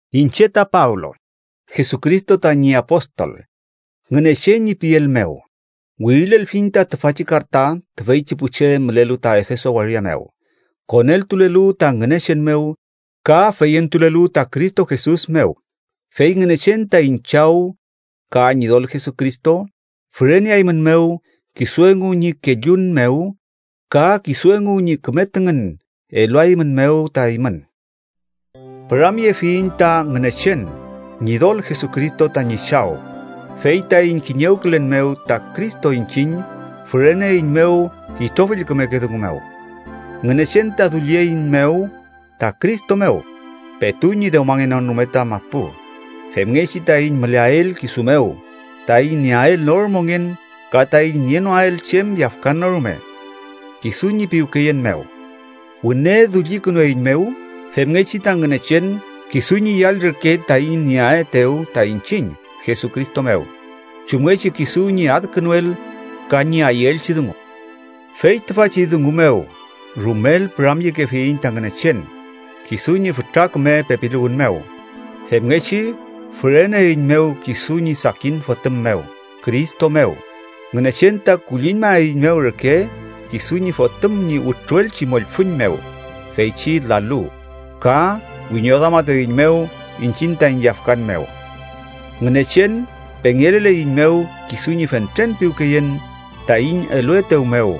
Iñche ta Pablo, Jesucristo tañi apostol Ngünechen ñi piel mew, wirilelfiñ ta tüfachi karta tüfeychi pu che mülelu ta Efeso waria mew, koneltulelu ta Ngünechen mew ka feyentulelu ta Cristo Jesus mew. Fey Ngünechen taiñ Chaw ka Ñidol Jesucristo füreneaeymünmew kisu engu ñi kellun mew ka kisu engu ñi küme tüngün eluaeymünmew ta eymün. Püramyefiyiñ ta Ngünechen Ñidol Jesucristo tañi Chaw, fey taiñ kiñewkülen mew ta Cristo iñchiñ füreneeiñmew itrofill kümeke dungu mew. Ngünechen ta dullieiñmew ta Cristo mew petu ñi dewmangenon rume ta mapu, femngechi taiñ müleael kisu mew, taiñ nieael nor mongen ka taiñ nienoael chem yafkan no rume. Kisu ñi piwkeyen mew wüne dullikünueiñmew femngechi ta Ngünechen kisu ñi yall reke taiñ nieaetew ta iñchiñ Jesucristo mew, chumngechi kisu ñi adkünuel ka ñi ayüelchi dungu. Fey tüfachi dungu mew rumel püramyekefiyiñ ta Ngünechen kisu ñi fütra küme pepiluwün mew, femngechi füreneeiñmew kisu ñi sakin Fotüm mew. Cristo mew, Ngünechen ta kulliñmaeiñmew reke kisu ñi Fotüm ñi wütruelchi mollfüñ mew feychi lalu, ka wiñoduamatueiñmew iñchiñ taiñ yafkan mew. Ngünechen pengeleleiñmew kisu ñi fentren piwkeyen taiñ eluetew mew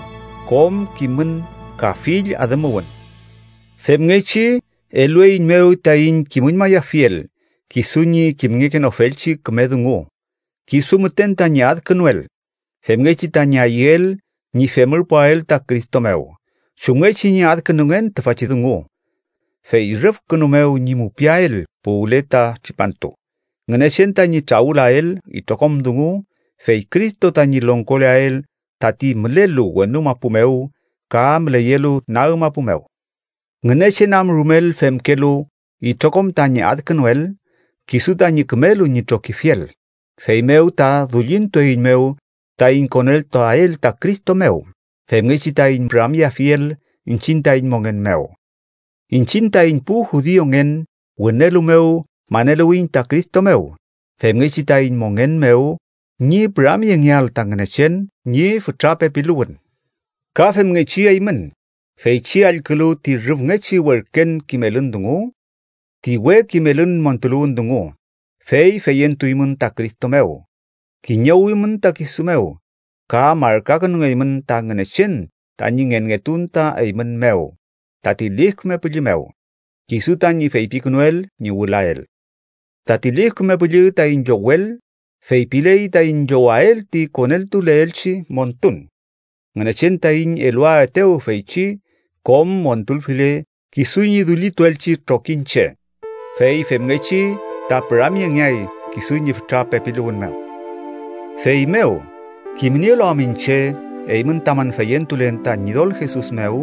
kom kimün ka fill adümuwün. Femngechi elueiñmew taiñ kimüñmayafiel kisu ñi kimngekenofelchi küme dungu kisu müten tañi adkünuel femngechi tañi ayüel ñi femürpuael ta Cristo mew chumngechi ñi adkünungen tüfachi dungu. Fey rüfkünu mew ñi mupiael puwle ta tripantu, Ngünechen tañi trawülael itrokom dungu, fey Cristo tañi longkoleael tati mülelu wenu mapu mew ka müleyelu nag mapu mew. Ngünechen am rumel femkelu itrokom tañi adkünuel kisu tañi kümelu ñi trokifiel, feymew ta dullintueiñmew taiñ koneltuael ta Cristo mew femngechi taiñ püramyeafiel iñchiñ taiñ mongen mew. Iñchiñ taiñ pu judiungen wünelu mew maneluwiyiñ ta Cristo mew, femngechi taiñ mongen mew ñi püramyengeael ta Ngünechen ñi fütra pepiluwün. Ka femngechi eymün, feychi allkülu ti rüfngechi werken kimelün dungu, ti we kimelün montuluwün dungu, fey feyentuymün ta Cristo mew, kiñewimün ta kisu mew, ka markakünungeymün ta Ngünechen tañi ngenngetun ta eymün mew tati Lif Küme Püllü mew, kisu tañi feypikünuel ñi wülael. Tati Lif Küme Püllü taiñ llowel feypiley taiñ llowael ti koneltuleelchi montun, Ngünechen taiñ eluaetew feychi kom montulfile kisu ñi dullituelchi trokiñche. Fey femngechi ta püramyengeay kisu ñi fütra pepiluwün mew. Feymew, kimnielu am iñche eymün tamün feyentulen ta Ñidol Jesus mew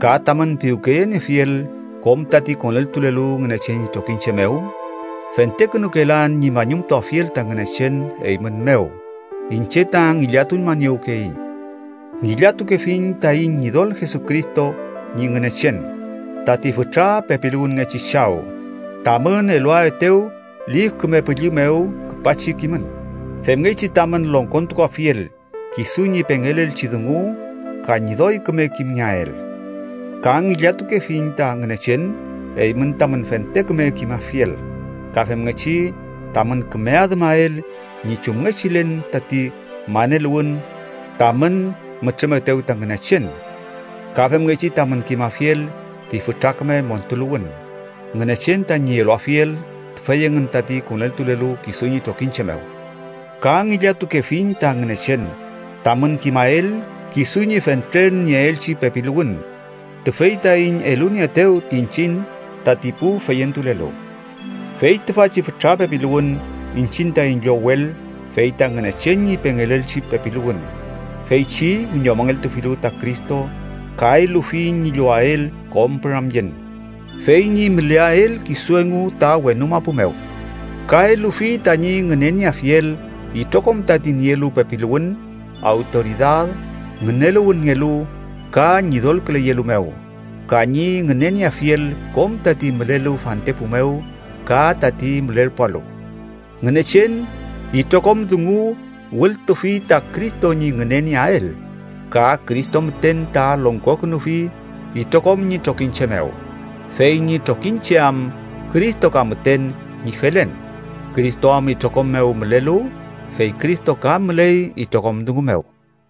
ka tamün piwkeyeniefiel kom tati koneltulelu Ngünechen ñi trokiñche mew, fentekünukelan ñi mañumtuafiel ta Ngünechen eymün mew, iñche ta ngillatuñmaniewkeyiñ. Ngillatukefiñ taiñ Ñidol Jesucristo ñi Ngünechen, tati fütra pepiluwünngechi Chaw, tamün eluaetew Lif Küme Püllü mew küpachi kimün, femngechi tamün longkontukuafiel kisu ñi pengelelchi dungu ka ñi doy küme kimngeael. Ka ngillatukefiñ ta Ngünechen eymün tamün fente küme kimafiel, ka femngechi tamün küme adümael ñi chumngechilen tati maneluwün tamün mütrümetew ta Ngünechen. Ka femngechi tamün kimafiel ti fütra küme montuluwün Ngünechen tañi eluafiel tüfey engün tati koneltulelu kisu ñi trokiñche mew. Ka ngillatukefiñ ta Ngünechen tamün kimael kisu ñi fentren nieelchi pepiluwün, tüfey taiñ elunieetew iñchiñ tati pu feyentulelu. Fey tüfachi fütra pepiluwün iñchiñ taiñ llowel fey ta Ngünechen ñi pengelelchi pepiluwün feychi wiñomongeltufilu ta Cristo ka elufi ñi llowael kom püramyen, fey ñi müleael kisu engu ta wenu mapu mew. Ka elufi tañi ngünenieafiel itrokom tati nielu pepiluwün, awtoridad, ngüneluwünngelu ka ñidolküleyelu mew ka ñi ngünenieafiel kom tati mülelu fantepu mew ka tati mülerpualu. Ngünechen itrokom dungu wültufi ta Cristo ñi ngünenieael, ka Cristo müten ta longkokünufi itrokom ñi trokiñche mew. Fey ñi trokiñche am Cristo ka müten ñi felen, Cristo am itrokom mew mülelu, fey Cristo ka müley itrokom dungu mew.